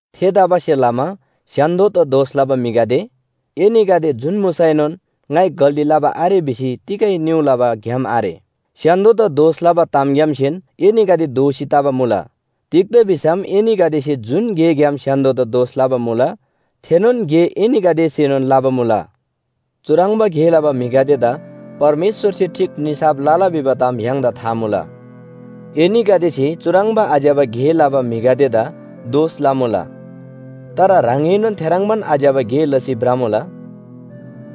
थेतबासेलमा स्‍य्‍हान्‍दोदा दोष लबा म्‍हिगदे, एनीगदे जुन मुसैनोन ङाइ गल्‍ती लबा आरे भिसी तिगै निउ लबा ग्‍याम आरे। स्‍य्‍हान्‍दोदा दोष लबा तामग्‍यामसेन एनीगदे दोषी तबा मुला। तिग्‍दा भिसम एनीगदेसे जुन गेग्‍याम स्‍य्‍हान्‍दोदा दोष लबा मुला थेनोन गे एनीगदेसेनोन लबा मुला। चुह्रङ्बा गे लबा म्‍हिगदेदा परमेश्‍वरसे ठीक निसाफ लला भिबा ताम य्‍हाङदा था मुला। एनीगदेसे चुह्रङ्बा आज्‍यबा गे लबा म्‍हिगदेदा दोष लमुला। तर ह्राङएनोन थेह्रङ्बान आज्‍यबा गे लसी भ्रमुला।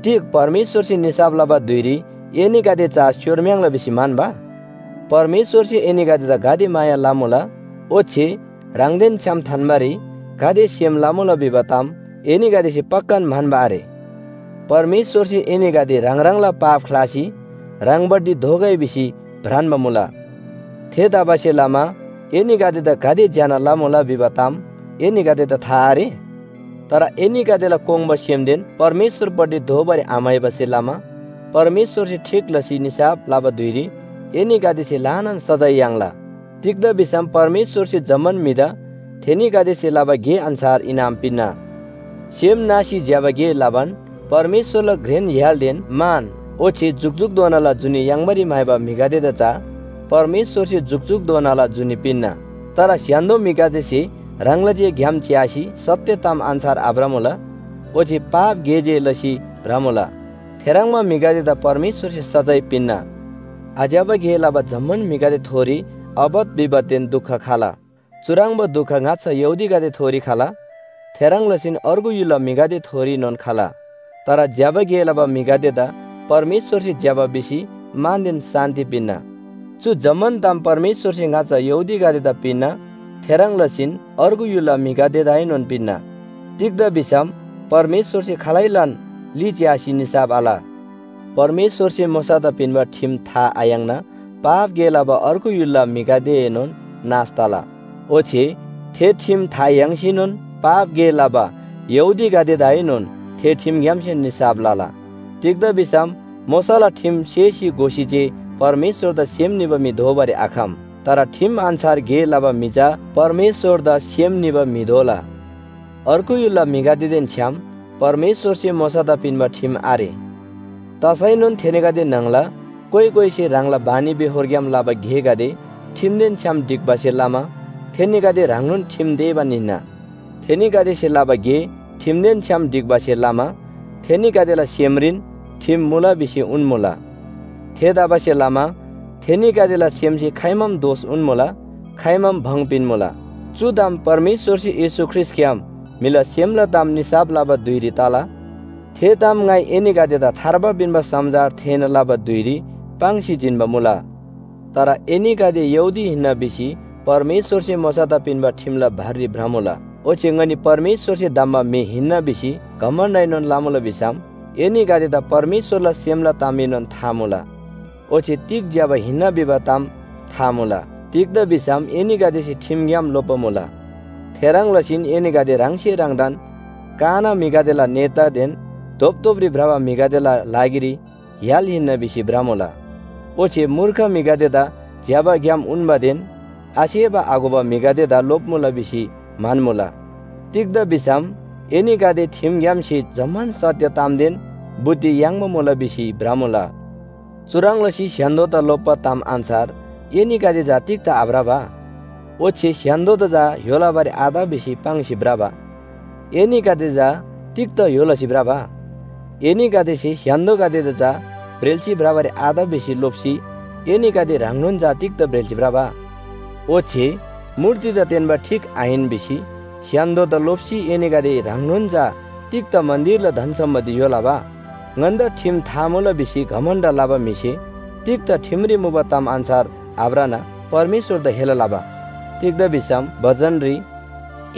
तिग परमेश्‍वरसे निसाफ लबा धुइरी एनीगदे चा स्‍योम्‍‍‍र्याङ्ला भिसी म्‍हन्‍बा? परमेश्‍वरसे एनीगदेदा गाते माया लमुला, ओच्‍छे ह्राङदेन छ्‌याम थान्‍बारी गाते सेम लमुला भिबा ताम एनीगदेसे पक्‍कान म्‍हन्‍बा आरे। परमेश्‍वरसे एनीगदे ह्राङ ह्राङला पाप ख्‍लासी ह्राङपट्टि दोःगै भिसी भ्रान्‍बा मुला। थेतबासेलमा एनीगदेदा गाते ज्‍यना लमुला भिबा ताम एनीगदेदा था आरे? तर एनीगदेला कोङ्बा सेमदेन परमेश्‍वरपट्टि दोःबारी आम्‍हाइबासे लमा परमेश्‍वरसे ठीक लसी निसाफ लबा धुइरी एनीगदेसे ल्‍हानान सजाय याङ्ला। तिग्‍दा भिसम परमेश्‍वरसे जम्‍मान म्‍हिदा थेनीगदेसे लबा गे अन्‍छार इनाम पिन्‍ना। सेम नासी ज्‍यबा गे लबान परमेश्‍वरला घ्रेन य्‍हालदेन मान ओच्‍छे जुकजुकधोनाला जुनी याङ्बारी म्‍हाइबा म्‍हिगदेदा चा परमेश्‍वरसे जुकजुकधोनाला जुनी पिन्‍ना। तर स्‍य्‍हान्‍दो म्‍हिगदेसे ह्राङला जे ग्‍याम च्‍यासी सत्‍य ताम अन्‍छार आभ्रमुला, ओच्‍छे पाप गे जे लसी भ्रमुला। थेह्रङ्बा म्‍हिगदेदा परमेश्‍वरसे सजाय पिन्‍ना। आज्‍यबा गे लबा जम्‍मान म्‍हिगदेथोरी आपत विपतदेन दुख खला। चुह्रङ्बा दुख ङाच्‍छा यहूदीगदेथोरी खला, थेह्रङ् लसीन अर्गु य्‍हुलला म्‍हिगदेथोरीनोन खला। तर ज्‍यबा गे लबा म्‍हिगदेदा परमेश्‍वरसे ज्‍यबा भिसी मानदेन शान्‍ति पिन्‍ना। चु जम्‍मान ताम परमेश्‍वरसे ङाच्‍छा यहूदीगदेदा पिन्‍ना, थेह्रङ् लसीन अर्गु य्‍हुलला म्‍हिगदेदाएनोन पिन्‍ना। तिग्‍दा भिसम परमेश्‍वरसे खालैलान ली च्‍यासी निसाफ आल। परमेश्‍वरसे मोशादा पिन्‍बा ठिम था आयाङ्ना पाप गे लबा अर्गु य्‍हुलला म्‍हिगदेएनोन नाश तला, ओच्‍छे थे ठिम था याङ्सीनोन पाप गे लबा यहूदीगदेदाएनोन थे ठिमग्‍यामसेन निसाफ लला। तिग्‍दा भिसम मोशाला ठिम सेसी घोसी जे परमेश्‍वरदा सेम निबा म्‍हि दोबारी आखम। तर ठिम अन्‍छार गे लबा म्‍हि चा परमेश्‍वरदा सेम निबा म्‍हि दोला। अर्गु य्‍हुलला म्‍हिगदेदेन छ्‌याम परमेश्‍वरसे मोशादा पिन्‍बा ठिम आरे। तसैनोन थेनीगदे न्‍हङला कोइ कोइसे ह्राङला बानीबेहोरग्‍याम लबा गेगदे ठिमदेन छ्‌याम ढिक्‍बासे लमा थेनीगदे ह्राङनोन ठिम तेबान हिन्‍ना। थेनीगदेसे लबा गे ठिमदेन छ्‌याम ढिक्‍बासे लमा थेनीगदेला सेमरीन ठिम मुला भिसी उन्‍मुला। थेतबासेलमा थेनीगदेला सेमसे खाइमाम दोष उन्‍मुला, खाइमाम भङ पिन्‍मुला। चु ताम परमेश्‍वरसे येशू ख्रीष्‍टग्‍याम म्‍हिला सेमला ताम निसाफ लबा धुइरी तला। थे ताम ङाइ एनीगदेदा थार्बा पिन्‍बा समाचार थेःना लबा धुइरी पाङ्सी जिन्‍बा मुला। तर एनीगदे यहूदी हिन्‍ना भिसी परमेश्‍वरसे मोशादा पिन्‍बा ठिमला भररी भ्रमुला, ओच्‍छे ङनी परमेश्‍वरसे धम्‍बा म्‍हि हिन्‍ना भिसी घमण्‍डएनोन लमुला भिसम, एनीगदेदा परमेश्‍वरला सेमला तामएनोन था मुला, ओच्‍छे तिग ज्‍यबा हिन्‍ना भिबा ताम था मुला, तिग्‍दा भिसम एनीगदेसे ठिमग्‍याम लोप्‍बा मुला। थेह्रङ् लसीन एनीगदे ह्राङसे ह्राङदान काना म्‍हिगदेला नेतादेन धोपधोपरी भ्रबा म्‍हिगदेला लागिरी य्‍हाल हिन्‍ना भिसी भ्रमुला। ओच्‍छे मूर्ख म्‍हिगदेदा ज्‍यबा ग्‍याम उन्‍बादेन आसेबा आघोबा म्‍हिगदेदा लोप्‍मुला भिसी म्‍हन्‍मुला। तिग्‍दा भिसम एनीगदे ठिमग्‍यामसे जम्‍मान सत्‍य तामदेन बुद्धि याङ्बा मुला भिसी भ्रमुला। चुह्रङ् लसी स्‍य्‍हान्‍दोदा लोप्‍बा ताम अन्‍छार एनीगदे चा तिग्‍दा आभ्रबा? ओच्‍छे स्‍य्‍हान्‍दोदा चा य्‍हो लबारी आत भिसी पाङ्सी भ्रबा, एनीगदे चा तिग्‍दा य्‍हो लसी भ्रबा? एनीगदेसे स्‍य्‍हान्‍दोगदेदा चा ब्रेल्‍सी भ्रबारी आत भिसी लोप्‍सी एनीगदे ह्राङनोन चा तिग्‍दा ब्रेल्‍सी भ्रबा? ओच्‍छे मूर्तिदा तेन्‍बा ठीक आहिन भिसी स्‍य्‍हान्‍दोदा लोप्‍सी एनीगदे ह्राङनोन चा तिग्‍दा मन्‍दिरला धन सम्‍पत्ति य्‍हो लबा? ङन्‍दा ठिम था मुला भिसी घमण्‍ड लबा म्‍हिसे तिग्‍दा ठिमरी मुबा ताम अन्‍छार आभ्रना परमेश्‍वरदा हेला लबा? तिग्‍दा भिसम बचनरी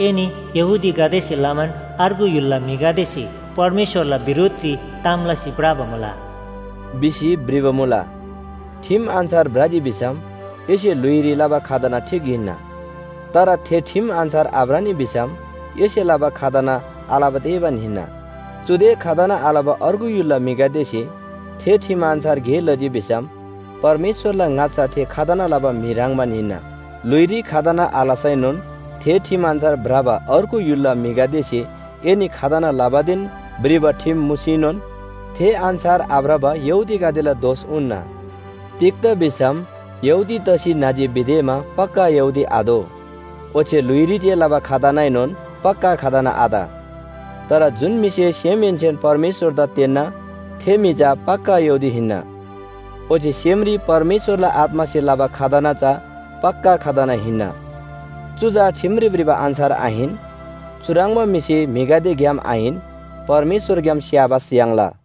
“एनी यहूदीगदेसे लमान अर्गु य्‍हुलला म्‍हिगदेसे परमेश्‍वरला बिरोधरी ताम लसी भ्रबा मुला” भिसी भ्रिबा मुला। ठिम अन्‍छार भ्रजी भिसम एसे ल्‍हुइरी लबा खतना ठीक हिन्‍ना। तर थे ठिम अन्‍छार आभ्रनी भिसम एसे लबा खतना आलबा तेबान हिन्‍ना। चुदे खतना आलबा अर्गु य्‍हुलला म्‍हिगदेसे थे ठिम अन्‍छार गे लजी भिसम परमेश्‍वरला ङाच्‍छा थे खतना लबा म्‍हि ह्रङ्‌बान हिन्‍ना। ल्‍हुइरी खतना आलसैनोन थे ठिम अन्‍छार भ्रबा अर्गु य्‍हुलला म्‍हिगदेसे एनी खतना लबादेन भ्रिबा ठिम मुसीनोन थे अन्‍छार आभ्रबा यहूदीगदेला दोष उन्‍ना। तिग्‍दा भिसम यहूदी तसी न्‍हजी भिदेमा पक्‍का यहूदी आदो। ओच्‍छे ल्‍हुइरी जे लबा खतनाएनोन पक्‍का खतना आत। तर जुन म्‍हिसे सेमहेन्‍सेन परमेश्‍वरदा तेन्‍ना थे म्‍हि चा पक्‍का यहूदी हिन्‍ना। ओच्‍छे सेमरी परमेश्‍वरला आत्‍मासे लबा खतना चा पक्‍का खतना हिन्‍ना। चु चा ठिमरी भ्रिबा अन्‍छार आहिन। चुह्रङ्बा म्‍हिसे म्‍हिगदेग्‍याम आहिन, परमेश्‍वरग्‍याम स्‍याबास याङ्ला।